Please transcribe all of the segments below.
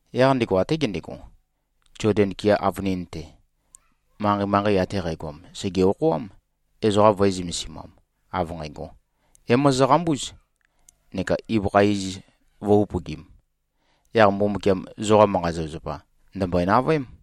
Yaq ndego até gendego, Zoden kea avønin-te, manqei-manqei ate qægoam sège-okhoám, ezoqa vø̄e-zømesimam, av nqægo, “É-mozoqambúz, neka ibøkha iz vø̄-upøgim. Yaq Mbumbukiam zoqa manqa-zapazapa, ndø̀mbøe-navøém.”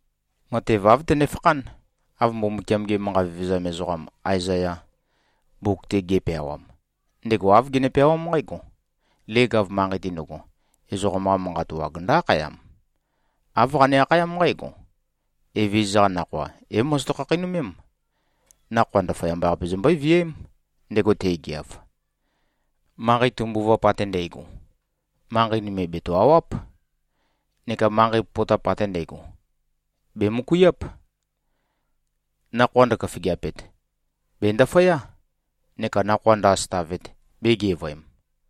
Matev āv tønefakhán, av Mbumbukiam-ge manqa vevezam ezoqam Aezaya, mbuk-te ge꞉peawam. Ndego āv gene-peawám nqǽgo, “Leg-av manqei-te ndøgo, ezoqam-qa manqa wag ndǿ-akhayam. Āv qane-akhayám nqǽgo, ‘Evezøza-qa nakhoa é-mozoto-khakheinømém. Nakhoa ndaføyamba-qape zombøé-viæém, ndego te꞉geav. Manqei tømbuvap ate ndægo, manqei nøme bètø-awáp, neka manqei popotap ate ndægo, bèmøkuiáp. Nakhoa ndøkhafigeapet, bèndaføyá, neka nakhoa ndø-asøtavet bēgevøem.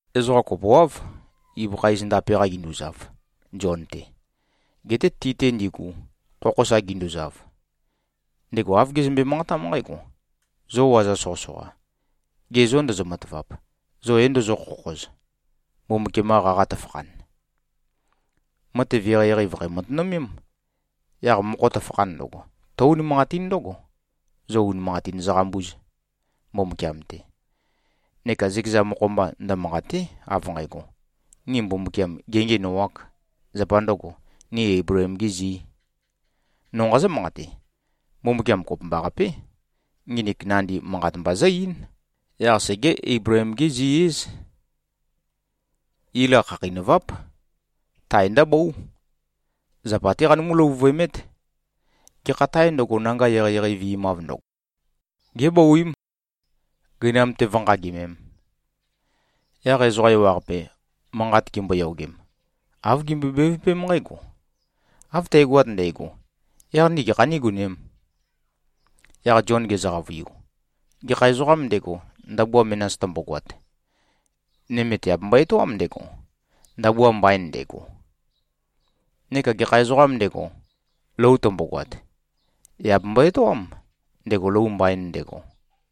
Ezoqa kopoáv, ibøkha iz ndape-qa ginduzav, Zion-te. Geté ti-te ndigu, khokho sa ginduzav, ndego āv gezømbe-manqatám nqǽgo, “Zo waza soqøsoqa. Ge zô, ndozo-matavap? Zo é-ndozó-khokhoz, Mbumbukiam-qa qaqa tøfakhan?” Matev eqeieqei vø̀khæ-matønømém. Yaq mokho tøfakhan ndøgo, tǿ-unimanqatín ndǿgo, zo unimanqatin zoqambúz, Mbumbukiam-te. Neka zøkeza mokho-mba ndømanqàte᷄, av nqægo, ni Mbumbukiam gēngiænoāk, zapa ndø̄go, ni Eibleem-gī zī. No nqazǿ-manqate: Mbumbukiam kopømbaqapé, nginik nandi manqat mba zǿ-eín. Yaq segé-Eibleem-gí-zi-íz. Ila khakheinøváp. Tae ndǿbóu. Zapa-té qanømú-løvuvøemét. Gekha tāe ndøgo, nanga eqeieqei vi꞉mav ndøgo, gébouím, gøinam-te vǿnqagimēm. Yaq ezoqa ewaqape, manqat gimboyogem, āv gimbøe-bevøpém nqǽgo, “Av tægoat ndægo, yaq ni gekha nígonēm?” Yaq Zion gezø-qavøiu, “Gekha ezoqām ndego, ndabua menas tømbogoat, nøme tèabembo-etoám ndego, ndabua mbain ndego. Neka gekha ezoqām ndego, lou tømbogoat, yà bembo-etoám ndego, lou mbain ndego.”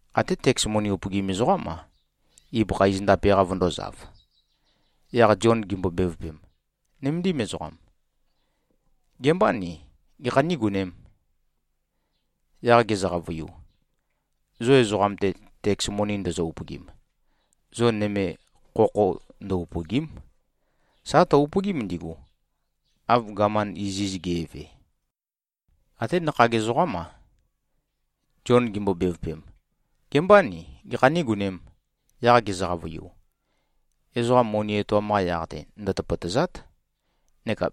Até teks moni upøgim ezoqám-a, ibøkha iz ndape-qa vøndōzav. Yaq Zion gimbo-bevøpem, “Nøméndim ezoqam. Gebâ ni? Gekhā nígonēm?” Yaq gezø-qavøiu, “Zo ezoqam-te, teks moni ndozo-upøgim, zo nøme khokho ndø-upø̀gi᷄m. Sà tø-upøgím ndigu, av gaman iziz ge꞉ve.” Até nakhag ezoqám-a, Zion gimbo-bevøpem, “Gebâ ni? Gekhā nígonēm?” Yaq gezø-qavøiu, “Ezoqa moni etoam-qa yaq-te ndøtøpøtø̀za᷄t. Neka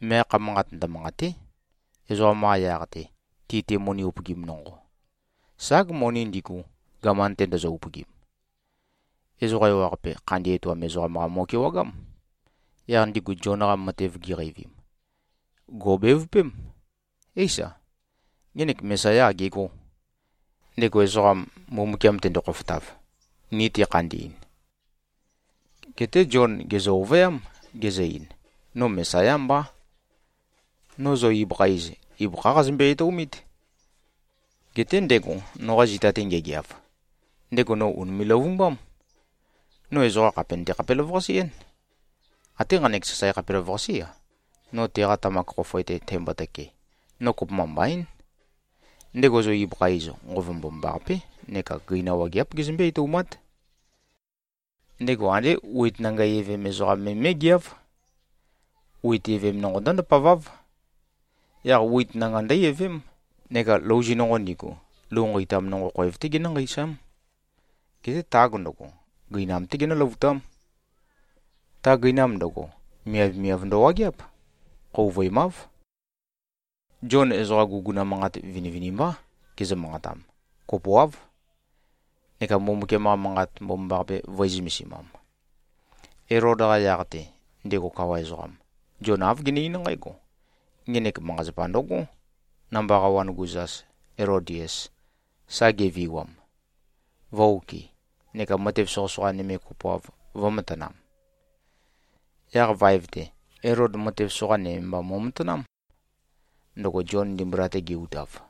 meakha manqat ndømanqàte᷄, ezoqam-qa yaq-te, ti-te moni upøgim nonqo. Ság, moni ndigu, gaman-te ndozo-upøgim.” Ezoqa ewaqape, khandi etoam ezoqam-qa mo꞉kewagám. Yaq ndigu Zion-qa matev giqeivim, gò꞉bevøpém, “Éisa. Ngenek Mesayá agegó, ndego ezoqam, Mbumbukiam tendo-khofotav, ni tekhandi꞉n.” Geté Zion gèzø-ovøyám, gezø-ein, “No Mesayá mbá. No zo ibøkha iz, ibøkhá qazømbe-etoumít. Geté ndego, noqa zita-te ngegeav, ndego no ùnime꞉-løvumbám. No ezoqa khàpe nøte-khapelavøqase-én. Até nqanek sasae khapelavøqasé-a, no teqa tamak khofoe-te tæmbotøke, no kopømba mbaín. Ndego zo ibøkha iz, Nqova Mbomambaqapé neka gøina wageáp gezømbé-etoumát. Ndego andé wit nanga evem ezoqam me mé꞉geáv. Wit evem nonqo ndǿ-ndapaváv. Yaq wit nanga ndǿ-evém, neka louzi nonqo ndigu, lou nqeitam nonqo khoev-té genǿ-nqeisám. Geté tag ndøgo, gøinam-té genǿløvutám. Ta gøinam ndøgo, miavmiav ndøwageáp. Khouvøemáv.” Zion ezoqa guguna manqat vinivinimbá gezø-manqatam, kopoáv, neka Mbumbukiam-qa Manqat Mbomambaqape vø̄e-zømesimam. Elod-qa yaq-te, ndego kawa ezoqam, Zion āv gene-eín nqǽgo, “Ngenek manqa-zapa ndøgó, namba qawan-gu zas, Elodias, sa geviwam, vø̄-okɨ neka matev soqøsoqa nøme kopoav vø̄matanam.” Yaq vaev-te, Elod matev soqa nøme mba mo꞉matanám, ndøgo Zion ndimbula-te ge-utav.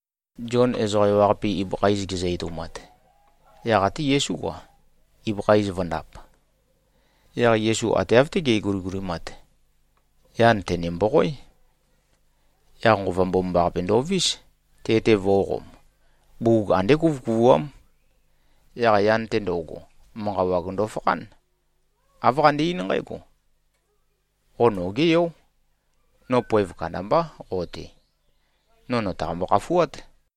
Zion ezoqa ewaqape ibøkha iz gezø-etoumat, yaq até Yesú-a, ibøkha iz vø̄ndap. Yaq Yesu ate av-té ge꞉guligulimat, yan tø̀ne-mboqoé. Yaq Nqova Mbomambaqape ndovís, te-te vō꞉qom. Bugug andé kuvøkuvuám. Yaq yan-te ndo꞉go, manqa wag ndofakhán. Āv qande-eín nqǽgo, “Qo nogé Yó. No poev kandambá qo-te. No nø̀taqambo-khafuát.”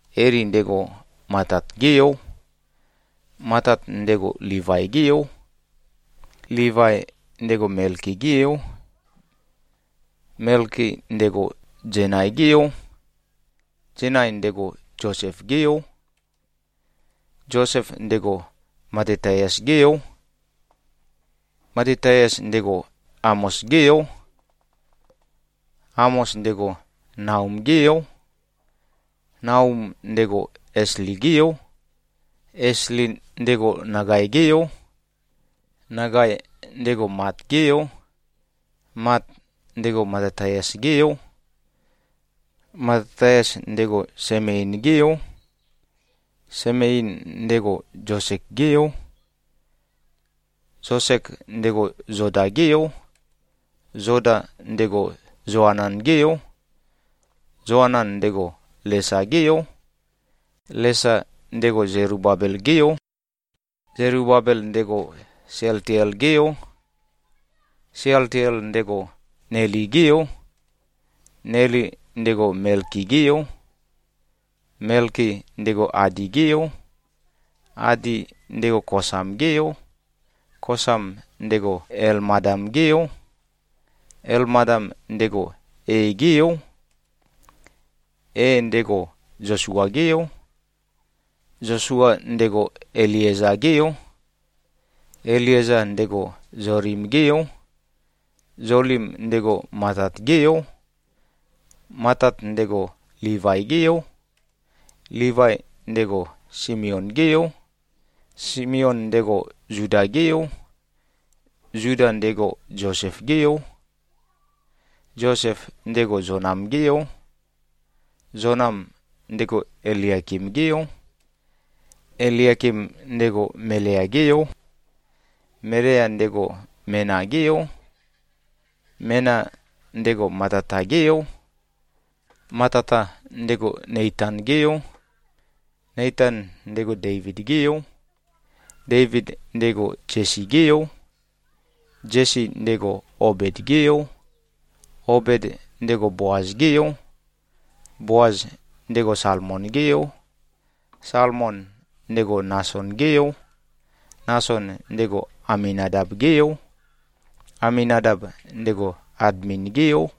Eli, ndego Matat-gé yó. Matat, ndego Livai-gé yo. Livai, ndego Melki-gé yó. Melki, ndego Zenai-gé yó. Zenai, ndego Zosef-gé yó. Zosef, ndego Matataias-gé yó. Matataias, ndego Amos-gé yó. Amos, ndego Naum-gé yó. Naum, ndego Esli-gé yó. Esli, ndego Nagai-gé yó. Nagai, ndego Mat-gé yó. Mat, ndego Matataias-gé yó. Matataias, ndego Semein-gé yó. Semein, ndego Zosek-gé yó. Zosek, ndego Zoda-gé yó. Zoda, ndego Zoanan-gé yó. Zoanan, ndego Lesa-gé yó. Lesa, ndego Zelubabel-gé yó. Zelubabel, ndego Sealtiel-gé yó. Sealtiel, ndego Neli-gé yó. Neli, ndego Melki-gé yó. Melki, ndego Adi-gé yó. Adi, ndego Kosam-gé yó. Kosam, ndego Elmadam-gé yó. Elmadam, ndego E-gé yó. E, ndego Zosua-gé yó. Zosua, ndego Elieza-gé yó. Elieza, ndego Zolim-gé yó. Zolim, ndego Matat-gé yó. Matat, ndego Livai-gé yó. Livai, ndego Simeon-gé yó. Simeon, ndego Zuda-gé yó. Zuda, ndego Zosef-gé yó. Zosef, ndego Zonam-gé yó. Zonam, ndego Eliakim-gé yó. Eliakim, ndego Melea-gé yó. Melea, ndego Mena-gé yó. Mena, ndego Matata-gé yó. Matata, ndego Neitan-gé yó. Neitan, ndego Deivid-gé yó. Deivid, ndego Zesi-gé yó. Zesi, ndego Obed-gé yó. Obed, ndego Boaz-gé yó. Boaz, ndego Salmon-gé yó. Salmon, ndego Nason-gé yó. Nason, ndego Aminadab-gé yó. Aminadab, ndego Admin-gé yó.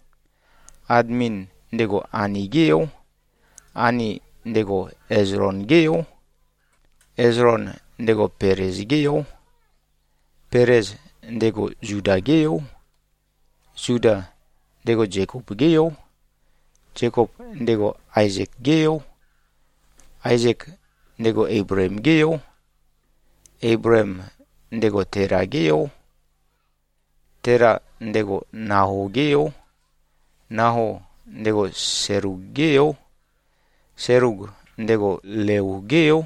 Admin, ndego Ani-gé yó. Ani, ndego Ezlon-gé yó. Ezlon, ndego Pelez-gé yó. Pelez, ndego Zuda-gé yó. Zuda, ndego Zekop-gé yó. Zekop, ndego Aezek-gé yó. Aezek, ndego Eibleem-gé yó. Eibleem, ndego Tela-gé yó. Tela, ndego Nao-gé yó. Nao, ndego Selug-gé yó. Selug, ndego Leu-gé yó.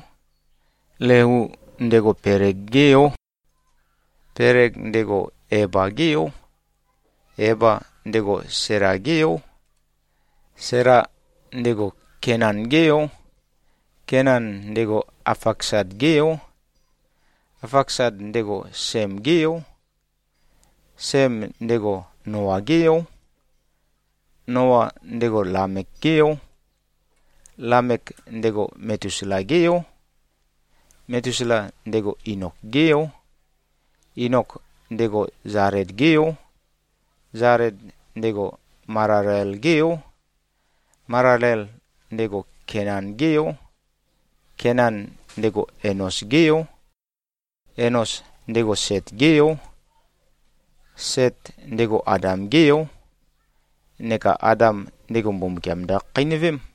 Leu, ndego Peleg-gé yó. Peleg, ndego Eba-gé yó. Eba, ndego Sela-gé yó. Sela, ndego Kenan-gé yó. Kenan, ndego Afaksad-gé yo. Afaksad, ndego Sem-gé yó. Sem, ndego Noa-gé yó. Noa, ndego Lamek-gé yó. Lamek, ndego Metusela-gé yó. Metusela, ndego Inok-gé yó. Inok, ndego Zaled-gé yó. Zaled, ndego Malalel-gé yó. Malalel, ndego Kenan-gé yó. Kenan, ndego Enos-gé yó. Enos, ndego Set-gé yó. Set, ndego Adam-gé yó. Neka Adam, ndego Mbumbukiam ndøkhakheinøvém.